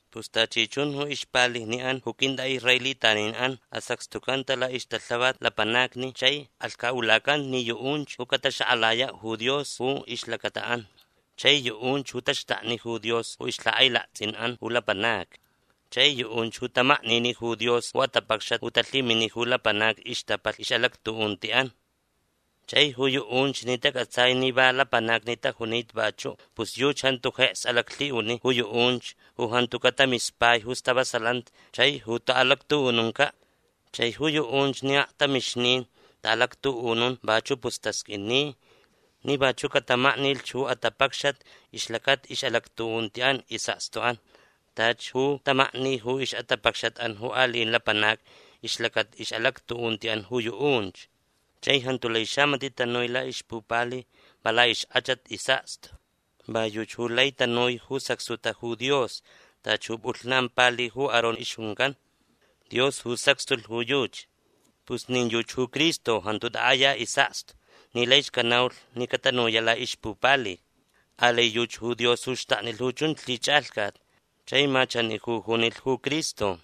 Pus tachi chun ju ixpalijni'an ju quint'a'israelitanin'an asacxtucanta la'ixtalhavat lapanacni chai alhca'ulacanta ni yu'unch ju cataxak'alaya' ju Dios ju ixlacata'an. Chai yu'unch ju taxtakni ju Dios ju ixlhak'ailakts'in'an ju lapanacni. Chai yu'unch ju tamaknini ju Dios ju atapacxat ju talhimini ju lapanacni ixtapalh ix'alactu'unti'an. Chai ju yu'unch ni tac'atsai ni va lapanacni tajunita vachu' pus yuchi jantu jeks alaclhi'uni ju yu'unch ju jantuca' tamispai ju stavasalanti chai ju ta'alactu'ununca'. Chai ju yu'unch ni aktamixnin ta'alactu'unun vachu' pus tasq'uini ni vachu' catamaknilh ju atapacxat ixlacata ix'alactu'unti'an is'akstu'an tachi ju tamakni ju ix'atapacxat'an ju ali'in lapanacni ixlacata ix'alactu'unti'an ju yu'unch. Chai jantu lai xamati' tanui la'ixpupali va la'ixk'achat is'akstu. Va yuchi ju lai tanui ju sacxtuta ju Dios tachi ju p'ulhnan pali ju Aarón ixjuncan. Dios ju sacxtulh ju yuchi. Pus nin yuchi ju Cristo jantu tak'aya is'akstu ni laich canaulh ni catanuya' la'ixpupali. Alai yuchi ju Dios ju xtaknilh ju chunch lhich'alhcat. Chai ma chani ju junilh ju Cristo: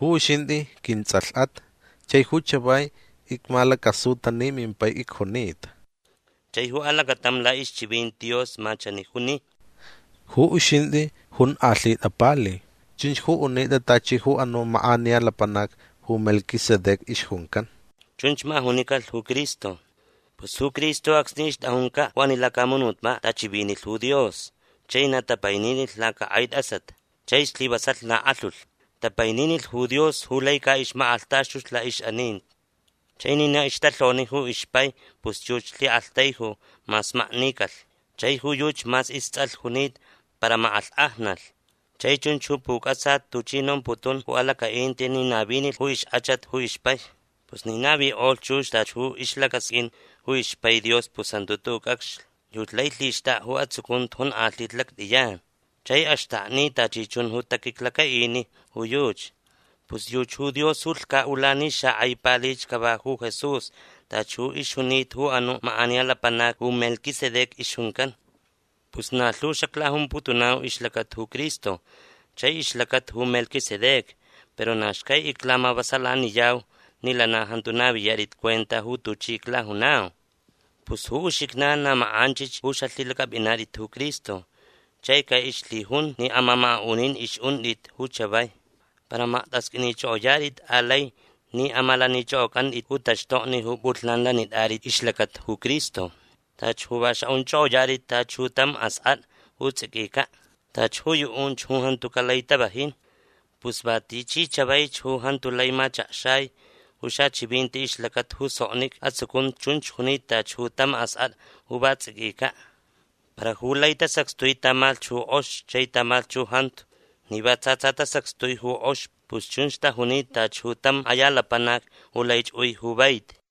Ju uxint'i quints'alh'at Chai ju chavai icmalacasuta ni mimpai icjunita. Chai ju alacatam la'ixchivinti Dios ma chani juni: Ju uxint'i onk'alhit'a pali. Chunch ju unit'a tachi ju anu' mak'aniya lapanac ju Melquisedec ixjuncan. Chunch ma junicalh ju Cristo. Pus ju Cristo acsni ixt'ajunca' ju ani lacamunutpa' t'achivinilh ju Dios chai na tapaininilh lacak'ai t'asat. Chai slivasalh na k'alhulh. Tapaininilh ju Dios ju lai ca'ixmak'alhtaxtulh la'ix'aninti. Chai ni na ixtalhoni ju ixpai pus yuchi lhi'aktaiju mas maknicalh. Chai ju yuchi mas ists'alh junita para mak'alhk'ajnalh. Chai chunch ju puc'atsa tuchi nomputun ju alaca'inti ni navinilh ju ixk'achat ju ixpai. Pus ni navik'olh chux tachi ju ixlacasq'uin ju ixpai Dios pus jantu tu'u' c'acxlh. Yuchi lai lhixt'ak'a ju atsucunti jonk'alhita lact'iyan. Chai axtakni tachi chun ju taquiclaca'ini ju yuchi. Pus yuchi ju Dios ju lhca'ula ni xak'ai palich cava ju Jesús tachi ju ixjunita ju anu' mak'aniya lapanac ju Melquisedec ixjuncan. Pus na lhu xaclajumputunau ixlacata ju Cristo chai ixlacata ju Melquisedec para na xcai iclamavasalaniyau ni lana jantu naviyat'it cuenta ju tuchi iclajunau. Pus ju uxijnan na mak'anchich ju xalhilac'ap'inat'it ju Cristo chai ca'ixlhijun ni amamaka'unin ix'unt'it ju chavai. Para makt'asq'uinich'ok'oyat'it alai ni amalanich'ok'oc'ant'it ju taxtokni ju p'ulhnan lanit'at'it ixlacata ju Cristo. Tachi ju va xa'unch'ok'oyat'it tachi ju tam ask'at'a ju ts'iquica'. Tachi ju yu'unch ju jantuca' lai tavajin. Pus va tichi chavaich ju jantu lai machakxai ju xachivinti ixlacata ju soknic'a atsucunti chunch junita tachi ju tam ask'at'a ju va ts'iquica'. Para ju lai tasacxtui tamalhch ju k'ox chai tamalhch ju jantu ni va tsa tsa tasacxtui ju k'ox pus chunch tajunita tachi ju tam k'aya lapanac ju laich ui ju vaiti.